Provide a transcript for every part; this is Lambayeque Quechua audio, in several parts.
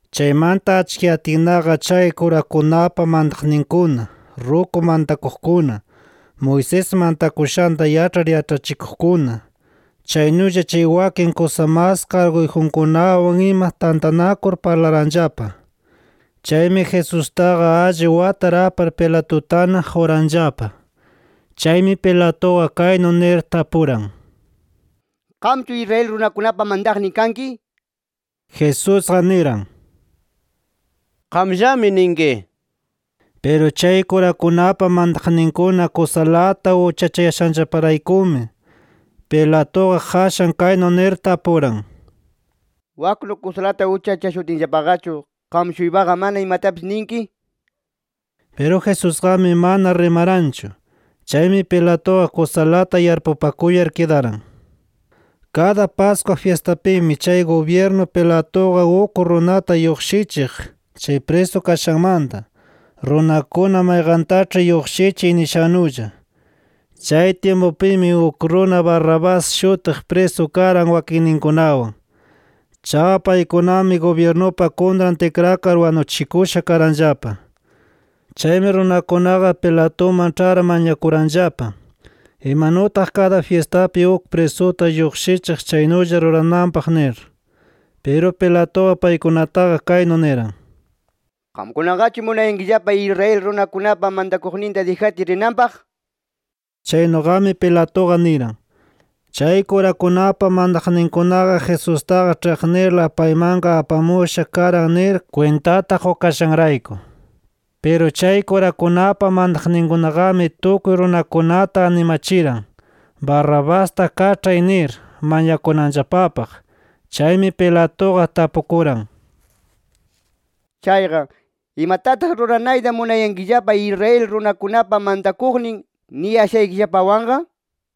Chaymanta achkiyatinnaqa chay kurakunapa mantaqninkuna, ruku mantakuqkuna, Moisés mantakushanta yaĉhar yaĉhachikuqkuna, chaynulla chay wakin kusa mas karguyjunkunawan ima tantanakur parlaranllapa. Chaymi Jesustaqa alli watar apar Pilatutana quranllapa. Chaymi Pilatuqa kaynu nir tapuran: —¿Qamchu Israel runakunapa mantaqnin kanki? nir. Jesusqa niran: —Qamllami ninki. Piru chay kurakunapa mantaqninkuna kusalata uchachayashanllaparaykumi, Pilatuqa qashan kaynu nir tapuran: —Waknu kusalata uchachashutinllapaqachu, ¿qam-shuypaqa mana imatapis ninki? Piru Jesusqami mana rimaranchu. Chaymi Pilatuqa kusalata yarpupakuyar kidaran. Kada Pascua fyistapimi chay gubyirnu Pilatuqa uk runata lluqshichiq chay prisu kashanmanta, runakuna mayqantaĉhi lluqshichiy nishannulla. Chay tyimpupimi uk runa Barrabás shutiq prisu karan wakinninkunawan. Chaqa paykunami gubyirnupa kuntran tikrakar wanuchikusha karanllapa. Chaymi runakunaqa Pilatuman ĉhar mañakuranllapa, imanutaq kada fyistapi uk prisuta lluqshichiq chaynulla rurananpaq nir. Piru Pilatuqa paykunataqa kaynu niran: —¿Qamkunaqachu munayankillapa, Israel runakunapa mantakuqninta dijatiy rinanpaq? nir. Chaynuqami Pilatuqa niran, chay kurakunapa mantaqninkunaqa Jesustaqa ĉhiqnirla paymanqa apamusha karan nir kwintata qukashanrayku. Piru chay kurakunapa mantaqninkunaqami tukuy runakunata animachiran, Barrabasta kaĉhay nir mañakunanllapapaq. Chaymi Pilatuqa tapukuran: —Chayqa ¿imatataq ruranayta munayankillapa Israel runakunapa mantakuqnin niyashaykillapawanqa?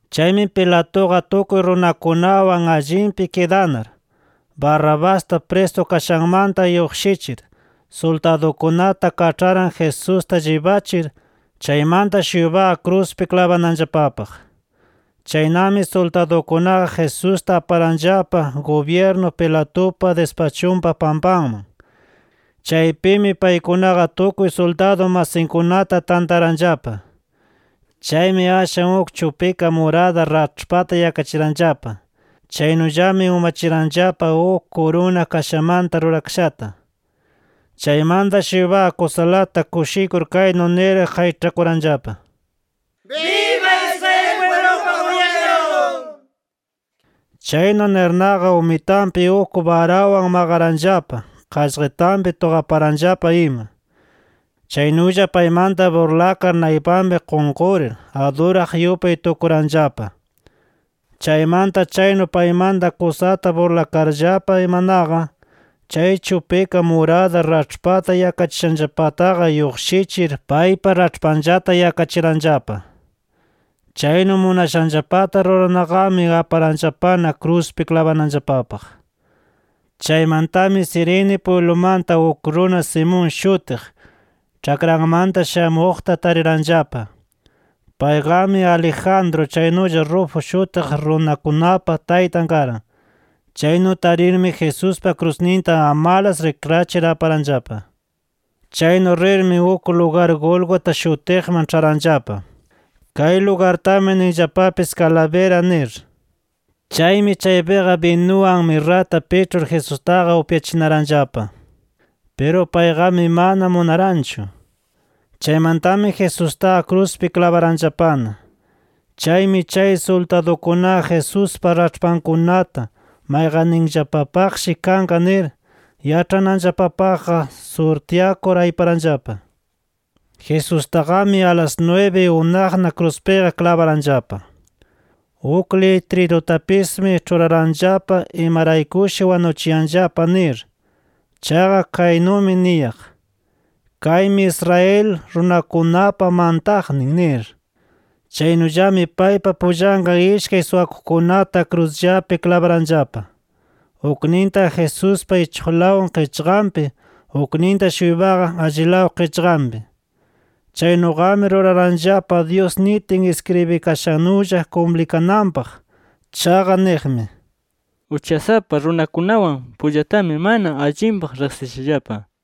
Chaymi Pilatuqa tukuy runakunawan allinpi kidanar, Barrabasta prisu kashanmanta lluqshichir, suldadunkunata kaĉharan Jesusta llibachir, chaymanta-shuypaqa kruspi klabananllapapaq. Chaynami suldadukunaqa Jesusta aparanllapa gubyirnu Pilatupa dispachunpa pampanman. Chaypimi paykunaqa tukuy suldadu masinkunata tantaranllapa. Chaymi ashwan uk chupika murada raĉhpata yakachiranllapa. Chaynullami umachiranllapa uk kuruna kashamanta rurakashata. Chaymanta-shuypaqa kusalata kushikur kaynu nir qayĉhakuranllapa: —¡Biba Israel pwiblupa gubyirnun! nir. Chaynu nirnaqa umitanpi uk barawan maqaranllapa, qaqllitanpi tuqaparanllapa ima. Chaynulla paymanta burlakar naypanpi qunqurir, aduraq yupay tukuranllapa. Chaymanta chaynu paymanta kusata burlakarllapa imanaqa, chay chupika murada raĉhpata yakachishanllapataqa lluqshichir paypa raĉhpanllata yakachiranllapa. Chaynu munashanllapata rurarnaqami aparanllapana kruspi klabananllapapaq. Chaymantami Cirene pwiblumanta uk runa Simón shutiq, ĉhakranmanta shamuqta tariranllapa. Payqami Alejandro chaynulla Rufo shutiq runakunapa taytan karan. Chaynu tarirmi Jesuspa krusninta amalas rikrachir aparanllapa. Chaynu rirmi uk lugar Gólgota shutiqman ĉharanllapa. Kay lugartami ninllapapis Calavera nir. Chaymi chaypiqa binuwan mirrata piĉhur Jesustaqa upyachinaranllapa. Piru payqami mana munaranchu. Chaymantami Jesustaqa kruspi klabaranllapana. Chaymi chay suldadukunaqa Jesuspa raĉhpankunata mayqanninllapapaqshi kanqa nir yaĉhananllapapaqqa surtyakur ayparanllapa. Jesustaqami alas nwibi unaqna kruspiqa klabaranllapa. Uk litrirutapismi ĉhuraranllapa imaraykushi wanuchishallapa nir. Chaqa kaynumi niyaq: “KAYMI ISRAEL RUNAKUNAPA MANTAQNIN” nir. Chaynullami paypa pullanqa ishkay suwakuqkunata krusllapi klabaranllapa, ukninta Jesuspa ichuqlaw qichqanpi, ukninta-shuypaqa allilaw qichqanpi. [ Chaynuqami ruraranllapa Dyus nitin iskribikashannulla kumplikananpaq. Chaqa niqmi: “Uchasapa runakunawan pullatami mana allinpaq riqsishallapa” nir.]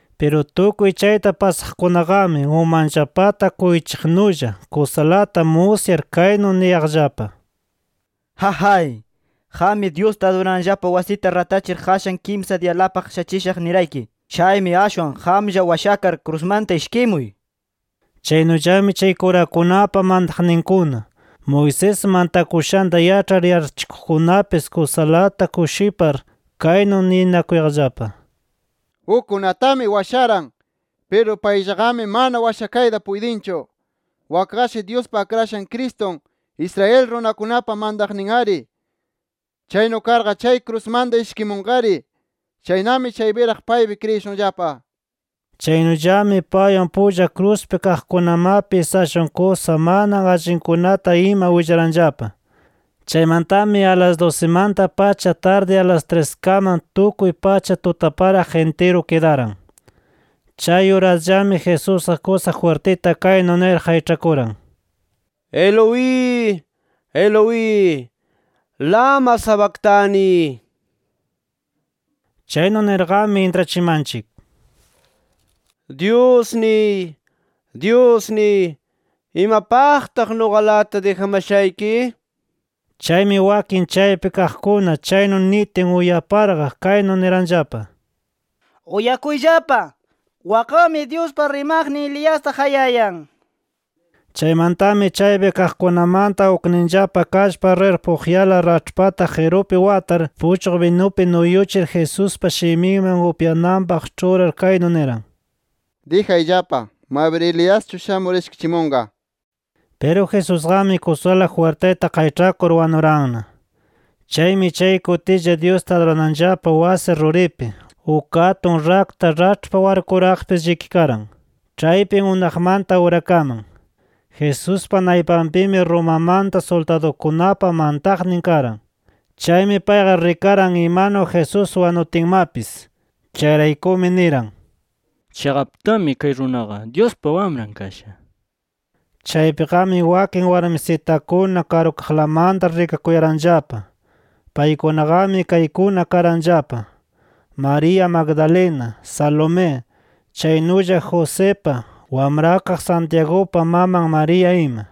Piru tukuy chayta pasaqkunaqami, umanllapata kuyuchiqnulla, kusalata musyar kaynu niyaqllapa: —¡Jajay! ¡Qammi, Dyusta adurananllapa wasita ratachir qashan kimsa diyalapaq shachishaq nirayki! ¡Chaymi ashwan qamlla washakar krusmanta ishkimuy! nir. Chaynullami chay kurakunapa mantaqninkuna, Moisés mantakushanta yaĉhar yaĉhachikuqkunapis kusalata kushipar, kaynu ninakuyaqllapa: —Ukkunatami washaran. Piru payllaqami mana washakayta puytinchu. Wakqashi Dyuspa Akrashan Cristun, Israel runakunapa mantaqnin-ari. ¡Chaynu karqa chay krusmanta ishkimunqari! ¡Chaynami chaypiraq paypi kriyishunllapa! Chaynullami paywan pulla kruspi kaqkunamapis ashwan kusa mana allinkunata ima willaranllapa. Chaymantami a las dusimanta-pacha tardi a las triskaman tukuy pacha tutaparaq intiru kidaran. Chay urasllami Jesusqa kusa jwirtita kaynu nir qayĉhakuran: “Eloi, Eloi, ¿lama sabactani?” (Chaynu nirqami intrachimanchik: “Dyusniy, Dyusniy, ¿imapaqtaq nuqalata dijamashayki?” nir). Chaymi wakin chaypi kaqkuna chaynu nitin uyaparqa kaynu niranllapa: —¡Uyakuyllapa! Wakqami Dyuspa rimaqnin Eliasta qayayan nir. Chaymantami chaypi kaqkunamanta ukninllapa kallpar rir puqyala raĉhpata qirupi watar puchqu binupi nuyuchir Jesuspa shiminman upyananpaq ĉhurar kaynu niran: —Dijayllapa, mabir Eliaschu shamur ishkichimunqa nir. Piru Jesusqami kusala jwirtita qayĉhakur wanuranna. Chaymi chay kutilla Dyusta adurananllapa wasi ruripi uk atun rakta raĉhpa warkuraqpis llikikaran ĉhaypin unaqmanta urakaman. Jesuspa naypanpimi Romamanta suldadukunapa mantaqnin karan. Chaymi payqa rikaran imanu Jesús wanutinmapis. Chayraykumi niran: —Chiqaptami kay runaqa Dyuspa Wamran kasha nir. Chaypiqami wakin warmisitakuna karukaqlamanta rikakuyaranllapa. Paykunaqami kaykuna karanllapa: María Magdalena, Salomé, chaynulla Josipa, wamrakaq Santiagupa maman María ima.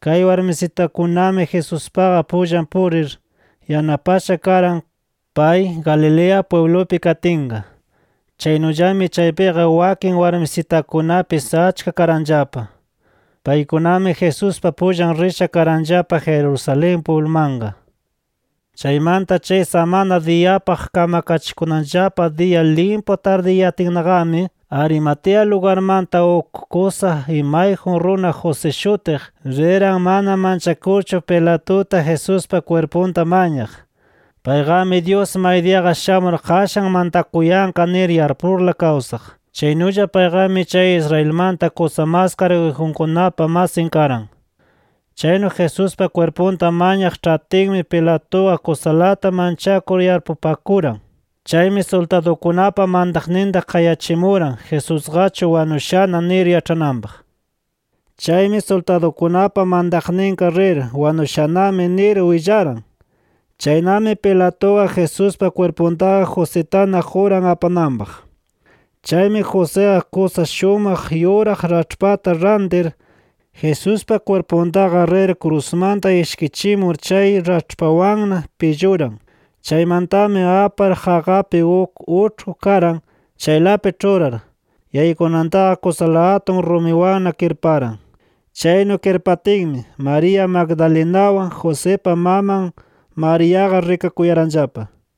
Kay warmisitakunami Jesuspaqa pullan purir, yanapasha karan pay Galilea pwiblupi katinqa. Chaynullami chaypiqa wakin warmisitakunapis achka karanllapa. Paykunami Jesuspa pullan risha karanllapa Jerusalén pwiblumanqa. Chaymanta chay samana diyapaq kamkachikunanllapa diya limpu tardiyayatinnaqami, Arimatea lugarmanta uk kusa imayjun runa José shutiq, riran mana manchakurchu Pilatuta, Jesuspa kwirpunta mañaq. Payqami Dyus maydiyaqa shamur qashan mantakuyanqa nir yarpurla kawsaq. Chaynulla payqami chay Israelmanta kusa mas karguyjunkunapa masin karan. Chaynu Jesuspa kwirpunta mañaq ĉhatinmi Pilatuqa kusalata manchakur yarpupakuran. Chaymi suldadukunapa mantaqninta qayachimuran Jesusqachu wanushana nir yaĉhananpaq. Chaymi suldadukunapa mantaqninqa rir “Wanushanami” nir willaran. Chaynami Pilatuqa Jesuspa kwirpuntaqa Jositana quran apananpaq. Chaymi Josiqa kusa shumaq yuraq raĉhpata rantir, Jesuspa kwirpuntaqa rir krusmanta ishkichimur chay raĉhpawanna pilluran. Chaymantami apar qaqapi uk uĉhku karan, chaylapi ĉhurar, yaykunantaqa kusala atun rumiwanna kirparan. Chaynu kirpatinmi, María Magdalenawan, Josipa maman Mariaqa rikakuyaranllapa.